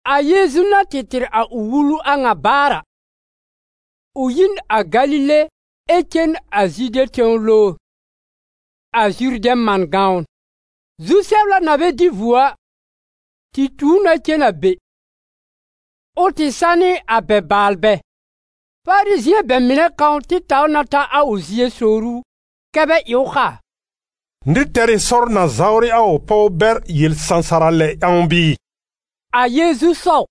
A Yeezu na tɩ tɩr a ʋ wulu a ŋa baar a, ʋ yi n a Galile ɛ cen a Zude tẽw lowr, a Zurdɛ̃ man gãwn. Zu-sɛbla na bɛ dɩ vuo a, tɩ tu ʋ na cen a be, ʋ tɩ sanɩ a bɛ baalbɛ. Farizɩ̃ɛ bɛ mɩnɛ kãw tɩ taw na ta a ʋ zie sowr ʋ kɛ́ bɛ ɩ ʋ kaa: «Nɩr tɛr ɩ sɔr na zawrɩ a ʋ pɔw bɛr yel-sãsara lɛ ƴãw bɩɩ?» A Yeezu sɔw: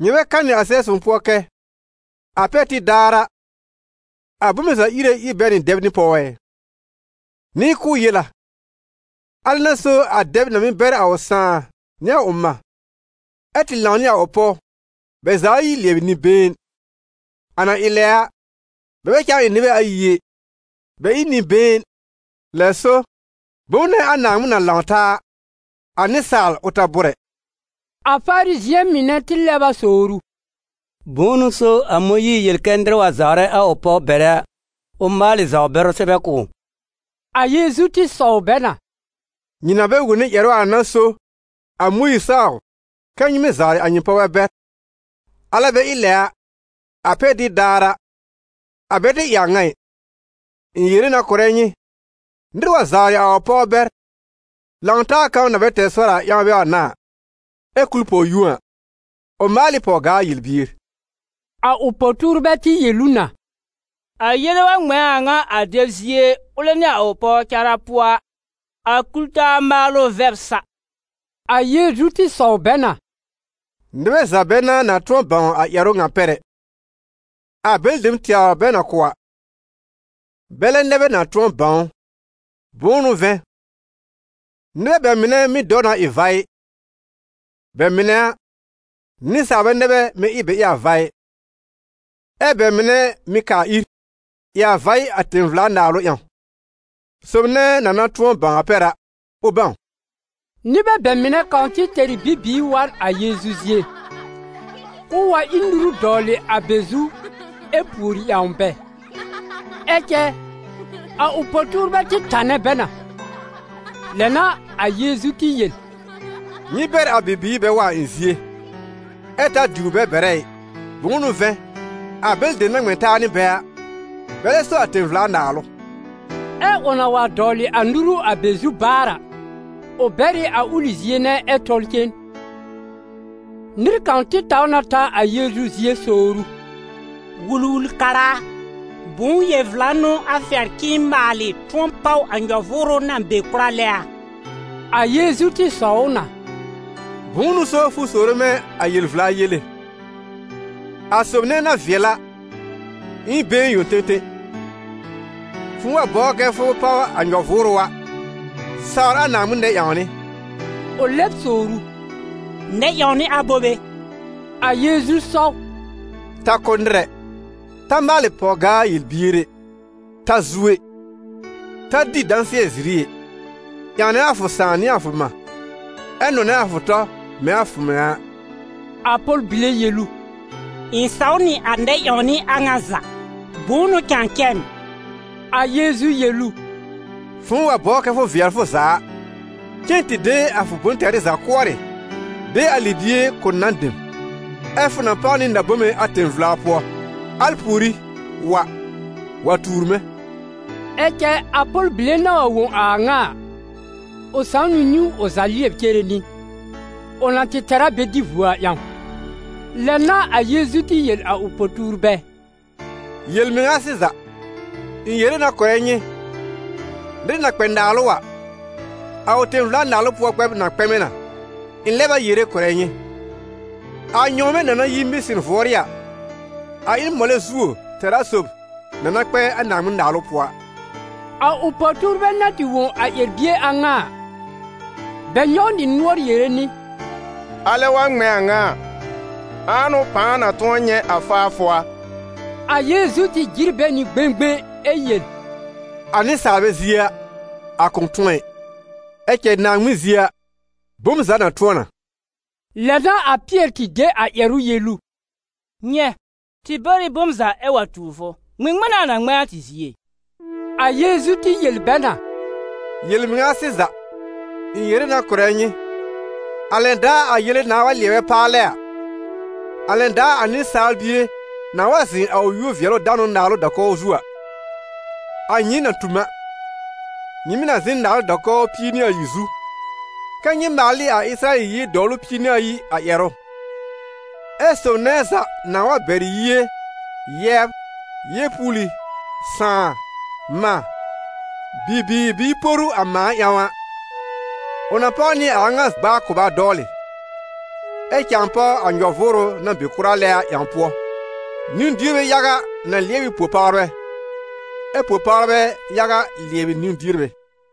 «Nyɩ bɛ kanɩ a Sɛb-sõw pʋɔ kɛ: ‹A pɛr tib daar a, a bome za Ire ír bɛ nɩ dɛb nɩ pɔw ɛ?› Nɩ k'ʋʋ tɩ yel a: ‹Alɛ n'a so a dɛb na mɩ́ bɛr a ʋ sãà nɩ a ʋ mã, ɛ tɩ lãw nɩ a ʋ pɔw bɛ za ayi lɩɛbɩ nɩ-been.› A na ɩ lɛ a, bɛ bɛ cãa ɩ nɩbɛ ayi ɛ, bɛ ɩ n nɩ-been. Lɛ so, bom nɛ a Naaŋmɩn na lãw taa a, a nɩsaal, ʋ ta bʋ́r ɛ.» A Farizɩ̃ɛ mɩnɛ tɩ lɛb a sowr ʋ: «Bʋ̃ʋ n'ʋ so a Mõyiir yel kɛ nɩr wa zawrɛ a ʋ pɔw bɛrɛ a, ʋ maalɩ zawr-bɛrʋ sɛbɛ kʋ̀ ʋ?» A Yeezu tɩ sɔw bɛ na: «Nyɩ na bɛ wone ƴɛrʋ a n'a so a Mõyiir saw kɛ nyɩ mɩ́ zawrɩ a nyɩ pɔwbɛ bɛr, alɛ bɛ ɩ lɛ a, a pɛr tib daar a, a bɛ tɩ ɩ a ŋa ɩ. Ɩ̃ yere na kʋ̀rɛ nyɩ: nɩr wa zawrɩ a ʋ pɔw bɛr - lãw-taa kãw na bɛ tɛr sɔr a ƴãw bɛ wa n'a a - ɛ kul pɔw-yũo a, ʋ maal ɩ pɔw-gaa yel-bier.» A ʋ po-tuurbɛ tɩ yel ʋ na: «A yele wa ŋmɛ̃ a ŋa a dɛb zie, ʋlɛ nɩ a ʋ pɔw cara pʋɔ a, a kul-taa maalʋ vɛb sa.» A Yeezu tɩ sɔw bɛ na: «Nɩbɛ za bɛ n'a na tʋ̃ɔ bãw a ƴɛrʋ ŋa pɛr ɛ, a bɛlɩ dem tɛwr bɛ na kʋ̀ a, bɛlɛ nɛ bɛ na tʋ̃ɔ bãw ʋ. Bʋ̃ʋ n'ʋ vɛ̃, nɩbɛ bɛ mɩnɛ mɩ́ dɔw na ɩ vaɩ; bɛ mɩnɛ a, nɩsaalbɛ nɛ bɛ mɩ́ ɩ bɛ ɩ a vaɩ; ɛ bɛ mɩnɛ mɩ̀ kaa ir, ɩ a vaɩ a tẽ-vla-naalʋ ƴãw. Sob nɛ na na tʋ̃ɔ bãw a pɛr a, ʋ bãw!» Nɩbɛ bɛ mɩnɛ kãw tɩ tɛr ɩ bibiir wa n a Yeezu zie, k'ʋʋ wa ír nuru dɔwlɩ a bɛ zu ɛ pùori ƴãw bɛ, ɛ cɛ a ʋ po-tuurbɛ tɩ tanɛ bɛ na. Lɛ n'a a Yeezu tɩ yel: «Nyɩ bɛr a bibiir bɛ wa a ɩ̃ zie, ɛ ta diwr bɛ bɛrɛ ɩ; bʋ̃ʋ n'ʋ vɛ̃, a bɛlɩ dem na ŋmɛ̃ taa nɩ bɛ a, bɛlɛ so a tẽ-vla-naalʋ.» Ɛ ʋ na wa dɔwlɩ a nuru a bɛ zu baar a, ʋ bɛr ɩ a ʋlɩ zie nɛ ɛ tɔl cen. Nɩr kãw tɩ taw na ta a Yeezu zie sowr ʋ: «Wul-wul-kara a, bʋ̃ʋ yel-vla n'ʋ a fɛr k'ɩ̃ɩ maalɩ tʋ̃ɔ páw a nyɔ-vʋʋrʋ na be kʋra lɛ a?» A Yeezu tɩ sɔw ʋ na: «Bʋ̃ʋ n'ʋ so fʋ sowre mɛ̃ a yel-vla yele? A sob nɛ na vɩɛl a, ɩ n been yõ tẽtẽ. Fʋ̃ʋ wa bɔbr kɛ fʋ páw a nyɔ-vʋʋrʋ a, sawr a Naaŋmɩn nɛ-ƴãwnɩ.» Ʋ lɛb sowr ʋ: «Nɛ-ƴãwnɩ abobe?» A Yeezu sɔw: «Ta kʋ́ nɩr ɛ; ta maalɩ pɔw-gaa yel-bier ɛ; ta zu ɛ; ta dɩ dãsɩɛ-ziri ɩ; ƴãwnɛ fʋ sãà nɩ fʋ mã; ɛ nɔnɛ fʋ tɔ mɛ̃ a fʋ mɩŋa a.» A pɔl-bile yel ʋ: «Ɩ̃ saw nɩ a nɛ-ƴãwnɩ a ŋa za. Bʋ̃ʋ n'ʋ cãa cɛ m?» A Yeezu yel ʋ: «Fʋ̃ʋ wa bɔbr kɛ fʋ vɩɛl fʋ za a, cen tɩ de a fʋ bʋ̃-tɛrɩ za kʋɔrɩ, de a libie kʋ̀ nan dem, ɛ fʋ na páw nɩ na-bome a tẽ-vla pʋɔ; al pùorí, wa, wa tuur mɛ̃.» Ɛ cɛ a pɔl-bile na wa wõ a a ŋa a, ʋ sãw nɩ niwn ʋ za lɩɛb cere nɩ, ʋ na tɩ tɛr a bɛ dɩ vuo a ƴãw. Lɛ n'a a Yeezu tɩ yel a ʋ po-tuurbɛ: «Yel-mɩŋa sɩza, ɩ̃ yere na kʋ̀rɛ nyɩ: nɩr na kpɛ naalʋ a, a ʋ tẽ-vla-Naalʋ pʋɔ kpɛb na kpɛmɛ na. Ɩ̃ lɛb a yere kʋ̀rɛ nyɩ, a nyɔ̃wmɛ̃ na na yi mɩsɩn vʋɔrɩ́ a, a ɩ n mɔlɛ zuo tɛra sob na na kpɛ a Naaŋmɩn-Naalʋ pʋɔ a.» A ʋ po-tuurbɛ na tɩ wõ a ƴɛr-bie a ŋa a, bɛ nyɔw nɩ nʋɔr yere nɩ: «Alɛ wa ŋmɛ̃ a ŋa a, ãa n'ʋ pãa na tʋ̃ɔ nyɛ̃ a faafʋ a?» A Yeezu tɩ jɩr bɛ nɩ gbẽgbẽ ɛ yel: «A nɩsaalbɛ zie a, a kʋ̃ tʋ̃ɔ ɩ, ɛ cɛ Naaŋmɩn zie a, bom za na tʋ̃ɔ na.» Lɛ n'a a Pɩɛr tɩ de a ƴɛrʋ yel ʋ: «Nyɛ̃, tɩ bɛr ɩ bom za ɛ wa tuur fʋ, ŋmɩŋmɩn n'a a na ŋmɛ̃ a tɩ zie?» A Yeezu tɩ yel bɛ na: «Yel-mɩŋa sɩza, ɩ̃ yere na kʋ̀rɛ nyɩ, a lɛn daar a yele nãà wa lɩɛbɛ paalɛ a, a lɛn daar a Nɩsaal Bie nãà wa zɩ̃ a ʋ yúor-vɩɛlʋ-danʋ naalʋ da-kɔw zu a, a nyɩɩm na tu m a, nyɩ mɩ̀ na zɩ̃ n naalʋ da-kɔwr pie nɩ ayi zu, kɛ́ nyɩ maal ɩ a Ɩsɩrayɛl yie dɔwlʋ pie nɩ ayi a ƴɛrʋ. Ɛ sob nɛ za nãà wa bɛr yie, yɛbr, yeepuuli, sãà, mã, bibiir bɩɩ poru a mãa ƴãw a, ʋ na páw nɩ a a ŋa gb'a a kʋba dɔwlɩ, ɛ cãa páw a nyɔ-vʋʋrʋ na be kʋra lɛ a ƴãw pʋɔ. Niwn-dierbɛ yaga na lɩɛb ɩ po-pawrbɛ, ɛ po-pawrbɛ yaga lɩɛbɩ niwn-dierbɛ.